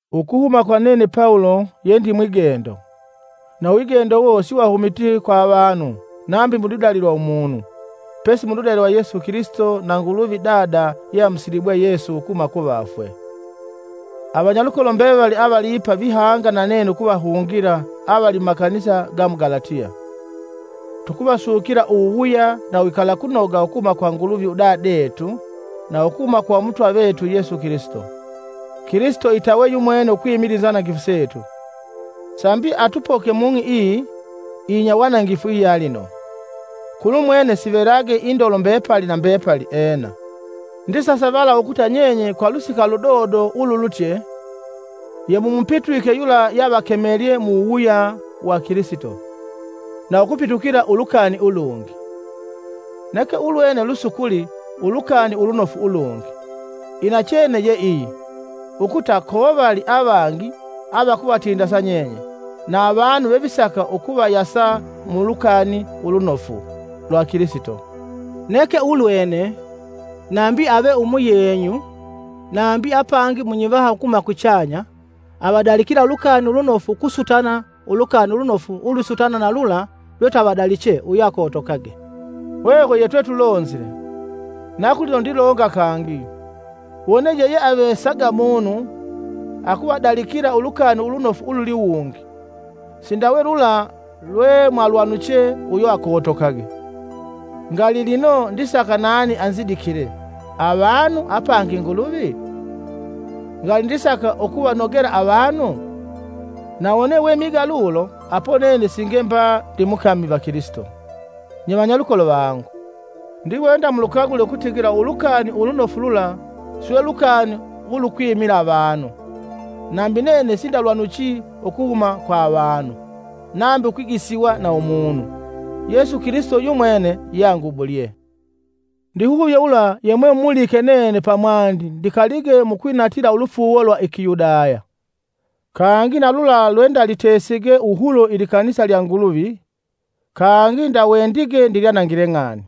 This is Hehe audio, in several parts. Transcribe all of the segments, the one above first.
Ukuhuma kwa nene Pawulo ye ndi mwigendo, na uwigendo uwo siwahumiti kwa avanu nambi muludali lwa umunu, pesi muludali lwa Yesu Kilisito na Nguluvi Dada ye amusilibwe Yesu ukuhuma ku vafwe. Avanyalukolo mbevali avaliipa vihanga na nene ukuvahungila avali mumakanisa ga mu Galatiya. Tukuvasukila uwuwuya na uwikalakunoga ukuhuma kwa Nguluvi udadetu na ukuhuma kwa Umutwa vetu Yesu Kilisito. Kilisito itawe yumwene ukwimila inzanangifu setu, sambi atupoke mung'i iyi iyinyawanangifu iyalino. Kulumwene sivelage indolo mbepali na mbepali! Ena. Ndisasavala ukuta nyenye kwa lusika ludodo ululutye, yemumupitwike yula yeavakemelye mu wuwuya wa Kilisito, na ukupitukila ulukani ulungi. Neke ulwene lusukuli, “Ulukani Ulunofu ulungi.” Inachene ye iyi ukuta kovali avangi avakuvatindasa nyenye, na avanu vevisaka ukuvayasa mu Ulukani Ulunofu lwa Kilisito. Neke ulwene, nambi ave umuyenyu nambi apangi munyivaha ukuhuma kuchanya, avadalikila ulukani ulunofu ukusutana ulukani ulunofu ulwisutana na lula lwetwavadaliche uyo akotokage. Hwehwe yetwetulonzile, na kulino ndilonga kangi: Wone yeyeavesaga munu akuvadalikila Ulukani Ulunofu ululiwungi, sindawe lula lwemwalwanuche, uyo akotokage! Ngali lino ndisaka nani anzidikile, avanu apangi Nguluvi? Ngali ndisaka ukuvanogela avanu? Na wone wemiga lulo, apo nene singe mba ndimukami va Kilisito. Nye vanyalukolo vangu, ndiwenda mulukagule ukutigila Ulukani Ulunofu lula silwe lukani ulukwimila avanu. Nambi nene sindalwanuchi ukuhuma kwa avanu, nambi ukwigisiwa na umunu. Yesu Kilisito yumwene yeangubulye. Ndihuvye ulwa yemwemupulike nene pamwandi ndikalige mukwinatila ulufuuwo lwa i Kiyudaya, kangi na lula lwendalitesige wuhulo ilikanisa lya Nguluvi kangi ndawendige ndilyanangile ng'ani.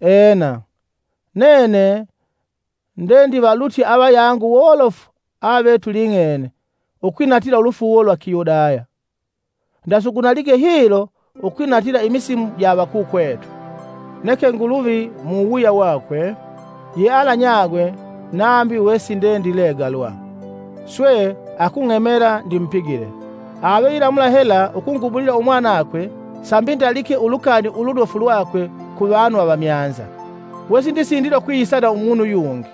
Ena, nene ndendivalutye avayangu wolofu avetuling'ene ukwinatila ulufuuwo lwa Kiyudaya, ndasugunalige hilo ukwinatilila imisimu ja avakukwetu. Neke Nguluvi, muwuwuya wakwe, yealanyagwe nambi wesindendilegalwa, swe akung'emela ndimupigile. Ave ilamula hela ukungubulila umwanakwe sambi ndalike Ulukani Ulunofu lwakwe kuvanu avamyanza, wesindisindila ukwiyisa na umunu yungi,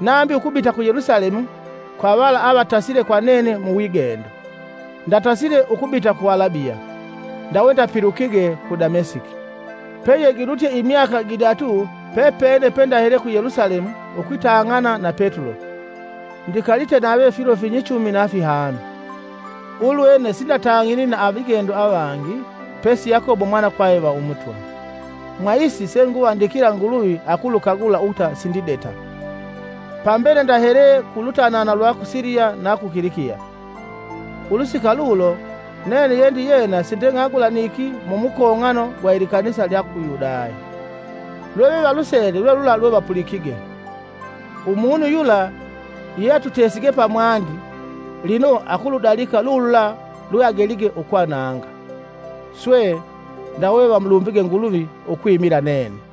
nambi ukubita ku Yelusalemu kwa vala avatasile kwa nene mu wigendo, ndatasile ukubita ku Alabiya, ndawe ndapilukige ku Damesiki. Peyegilutye imyaka gidatu pepene pe ndahele ku Yelusalemu ukwitang'ana na Petulo; ndikalite nave filo finyichumi na fihanu. Ulwene sindatang'ini na avigendo avangi pesi Yakobo umwanakwave va Umutwa. Mwa isi senguvandikila Nguluvi akulukagula ukuta sindideta. Pambele ndahele ku lutanana lwa ku Siliya na ku Kilikiya. Ulusika lulo, nene yendiyena sindeng'agulaniki mumukong'ano gwa ilikanisa lya ku Yudaya. Lwevevalusele lwe lula lwevapulikige, “Umunu yula ye atutesige pamwandi, lino akuludalika lulula lweagelige ukwananga.” Swe, ndawe vamulumbige Nguluvi ukwimila nene.